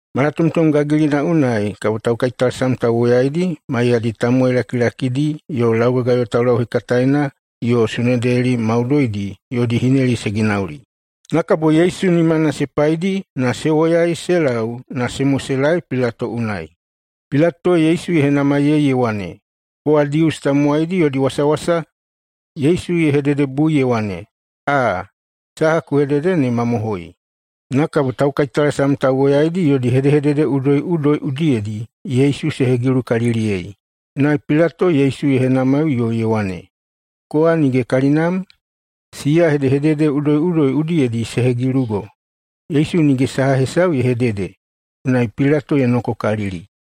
Malatomtom gagilina unai kabo taukaitalasam tauwoyaidi maiyadi tamowai lakilakidi yo laugagayo taulauhekataena yo Sunedeli maudoidi yodi hineli se ginauli. Na kabo Yesu nimana se paidi na se woyai se lau na se moselaei Pilato unai. Pilato Yesu ye henamaiyei ye wane, “Kowa Dius tamowaidi yodi wasawasa?” Yesu ye hededebui ye wane, “Aa, saha ku hedede ne mamohoi.” Na kabo taukaitalasam tauwoyaidi yodi hedehedede udoiꞌudoi udiyedi Yesu se hegilukaliliyei. Unai Pilato Yesu ye henamaiꞌuyoi ye wane, “Kowa nige kalinam? Siya hedehedede udoiꞌudoi udiyedi se hegilugo.” Yesu nige saha hesau ye hedede, unai Pilato ye nokokalili.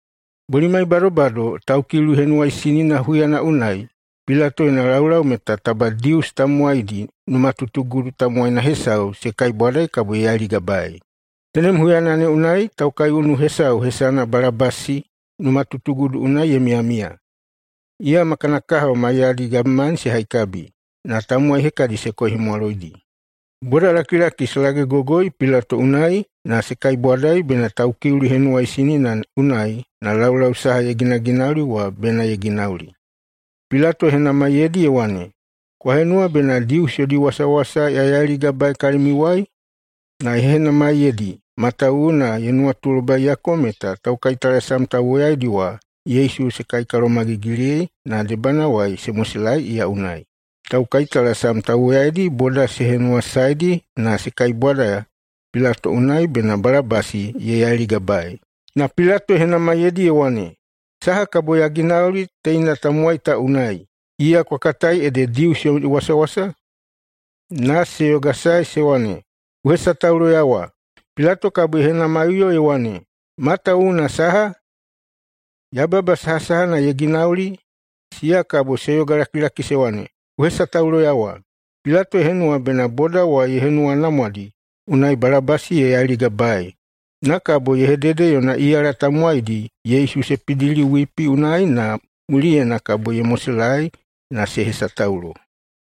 Bolimai badobado Taukiuli Henuwaisinina huyana unai Pilato yona laulau meta taba Dius tamowaidi numatutugudu tamowaina hesau se kaibwadai, kabo ye yailigabaei. Tenem huyana ne unai taukaiunu hesau hesana Balabasi numatutugudu unai ye miyamiya. Iya ma kana kahao maiyadi gabemani se haikabi, na tamowai hekadi se koihemwaloidi. Bodalakilaki se lagegogoi Pilato unai na se kaibwadai bena Taukiuli Henuwaisinina unai na laulau saha ye ginaginauli wa bena ye ginauli. Pilato ye henamaiyeidi ye wane, “Kwa henuwa bena Dius yodi wasawasa ya yailigabaei kalimiuwai?” Na ye henamaiyeidi, matawuwuna ye nuwatulobaiyako meta taukaitalasam tauwoyaidi wa Yesu se kaikalomagigiliyei na debanawai se moselaei iya unai. Taukaitalasam tauwoyaidi boda se henuwasaedi na se kaibwada Pilato unai bena Balabasi ye yailigabaei. Na Pilato ye henamaiyeidi ye wane, “Saha kabo ya ginauli teina tamowai ta unai, iya kwa katai ede Dius yomi wasawasa?” Na se yogasae se wane, “Ku hesatauloyawa!” Pilato kabo ye henamaiꞌuyo ye wane, “Matawuwuna saha? Yababa sahasahana ye ginauli?” Siya kabo se yogalakilaki se wane, “Ku hesatauloyawa!” Pilato ye henuwa bena boda wa ye henuwanamwadi, unai Balabasi ye yailigabaei. Na kabo ye hedede yona iyala tamowaidi Yesu se pidili wipi unai na mulinaena kabo ye moselaei na se hesataulo.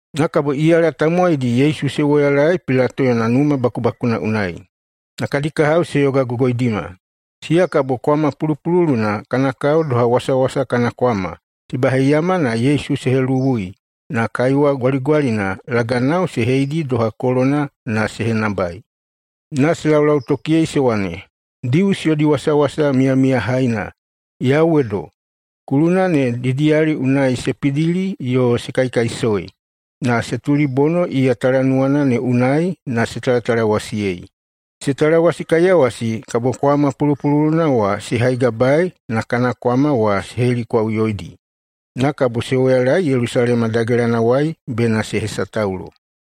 Na kabo iyala tamowaidi Yesu se woyalaei Pilato yona numa bakubakuna unai na kadi kahao se yogagogoidima. Siya kabo kwama pulupululuna [kana kao doha wasawasa kana kwama] se baheiyama na Yesu se heluwui na kaiwa gwaligwalina laganao se heidi doha kolona na se henabai. Na se laulautokiyei se wane, “Dius yodi wasawasa miyamiyahaina, yauwedo!” Kuluna ne didiyali unai se pidili yo se kaikaisoi, na se tulibono iya talanuwana ne unai na se talatalawasiyei. Se talawasikaiyawasi kabo kwama pulupululuna wa se haigabaei na kana kwama wa se helikwaꞌuyoidi. Na kabo se woyalaei Yelusalema dagelanawai bena se hesataulo.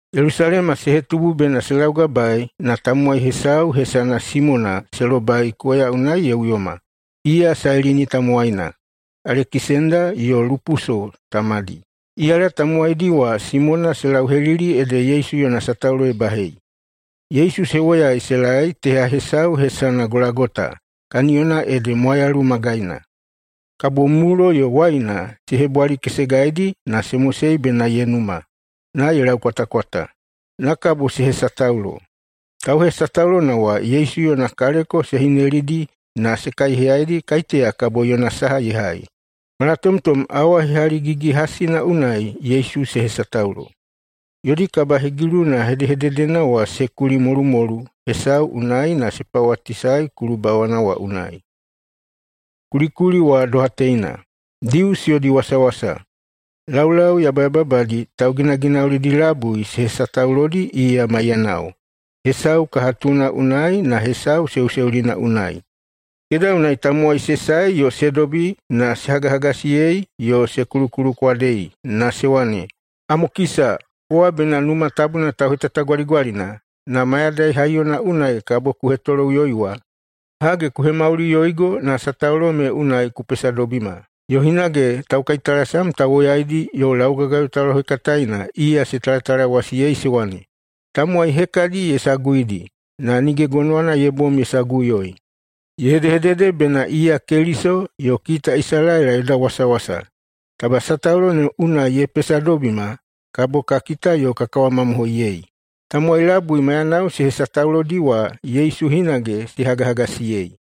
Yelusalema se hetubu bena se laugabaei na tamowai hesau hesana Simona se lobai koya unai ye uyoma. Iya Sailini tamowaina, Alekisenda yo Lupuso tamadi. Iyala tamowaidi wa Simona se lauhelili ede Yesu yona sataulo ye bahei. Yesu se woyai se laei teha hesau hesana Golagota, kaniyona ede mwayalu magaina. Kabo mulo yo waina se hebwalikesegaidi na se mosei bena ye numa, na ye laukwatakwata. Na kabo se hesataulo. Tauhesataulona wa Yesu yona kaleko se hinelidi na se kaiheyaidi kaiteya kabo yona saha ye hai. Malatomtom awa hehaligigi-hasina unai Yesu se hesataulo. Yodi kabahegiluna hedehededena wa se kuli [molumolu hesau unai] na se pawatisae kulubawana wa unai. Kulikuli wa doha teina, “DIUS YODI WASAWASA.” Laulau yabayababadi tauginaginaulidi labui se hesataulodi iya maiyanao, hesau kahatuna unai na hesau seuseulina unai. Keda unai tamowai se sae yo se dobi na se hagahagasiyei yo se kulukulukwadei na se wane, “Amokisa! Kowa bena Numa Tabuna tauhetatagwaligwalina, na mayadai haiyona unai kabo ku hetoloꞌuyoi wa! Hage, ku hemauliꞌuyoigo na sataulo me unai ku pesadobima!” Yo hinage taukaitalasam tauwoyaidi yo laugagayo taulauhekataena iya se talatalawasiyei se wane, “Tamowai hekadi ye saguidi, na nige gonowana ye bom ye saguꞌuyoi! Ye hedehedede bena iya Keliso, yo kita Isalaela yoda wasawasa. Taba sataulo ne unai ye pesadobima, kabo ka kita yo ka kawamamohoiyei.” Tamowai labui maiyanao se hesataulodi wa Yesu hinage se hagahagasiyei.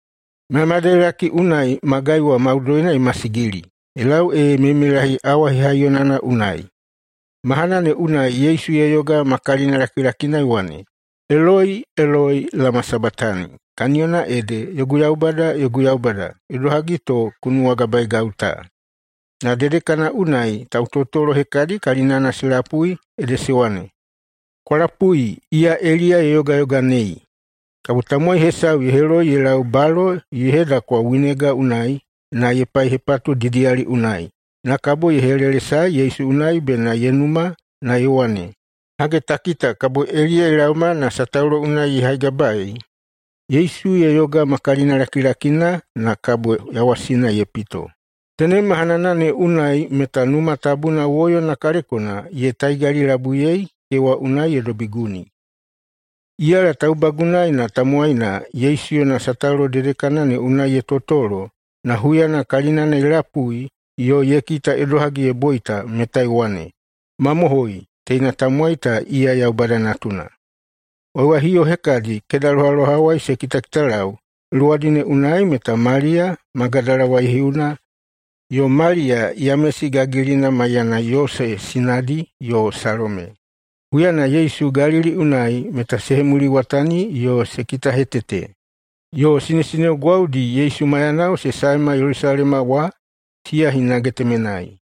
Mayamayadailaki unai magai wa maudoina ye masigili ye lau ee meimeilahi awa hehaiyonana unai. Mahanana ne unai Yesu ye yoga ma kalinalakilakina ye wane, “Eloi, eloi, lama sabatani?”, kaniyona ede, “Yogu Yaubada, yogu Yaubada, idohagi to ku nuwagabaegau ta?” Na dedekana unai tautotolo hekadi kalinana se lapui ede se wane, “Kwa lapui! Iya Eliya ye yogayoganei.” Kabo tamowai hesau ye heloi ye lau balo ye hedakwa winega unai, na ye paihepatu didiyali unai, na kabo ye helelesae Yesu unai bena ye numa, na ye wane, “Hage ta kita, kabo Eliya ye laoma na sataulo unai ye haigabaei.” Yesu ye yoga ma kalinalakilakina, na kabo yawasina ye pito. Tenem mahanana ne unai meta Numa Tabuna woyona kaleko ye taigalilabuiyei kewa unai ye dobi guni. Iyala taubagunaena tamowaina Yesu yona sataulo dedekana ne unai ye totolo, na huyana kalinana ye lapui yo ye kita idohagi ye boita meta ye wane, “Mamohoi, teina tamowai ta iya Yaubada Natuna!” Waiwaihiuwo hekadi kedalohawai se kitakitalau. Luwadi ne unai meta Maliya, Magadala waihiuna, yo Maliya Yamesi gagilina maiyana Yose sinadi, yo Salome. Huyana Yesu Galili unai meta se hemuliwatani yo se kitahetete. Yo sinesineo gwaudi Yesu maiyanao se saema Yelusalema wa, siya hinage temenai.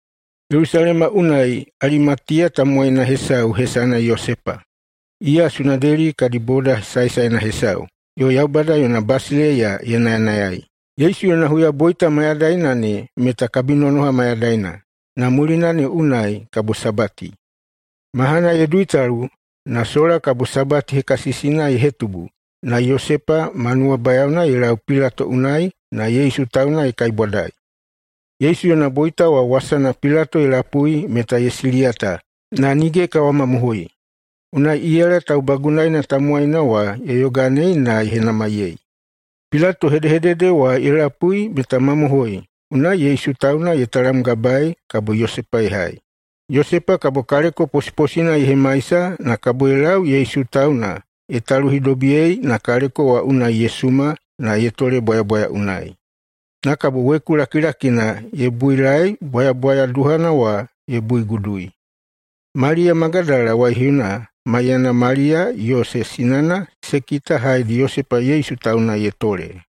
Yelusalema unai Alimatiya tamowaina hesau hesana Yosepa. Iya Sunedeli kadi boda saesaena hesau yo Yaubada yona basileiya ye nayanayai. Yesu yona huyaboita mayadaina ne meta kabinonoha mayadaina, na mulina ne unai kabo Sabati. Mahana ye duitalu [na sola kabo Sabati hekasisina ye hetubu] na Yosepa ma nuwabayaona ye lau Pilato unai na Yesu tauna ye kaibwadai. Yesu yona boita wa wasana Pilato ye lapui meta ye siliyata na nige ye kawamamohoi. Unai iyala taubagunaena tamowaina wa ye yoganei na ye henamaiyei. Pilato hedehedede wa ye lapui meta mamohoi, unai Yesu tauna ye talamgabaei kabo Yosepa ye hai. Yosepa kabo kaleko posiposina ye hemaisa na kabo ye lau Yesu tauna ye taluhidobiyei na kaleko wa unai ye suma, na ye tole bwayabwaya unai. Na kabo weku lakilakina ye builae bwayabwaya duhana wa ye buigudui. Maliya Magadala waihiuna maiyana Maliya Yose sinana se kita haedi Yosepa Yesu tauna ye tole.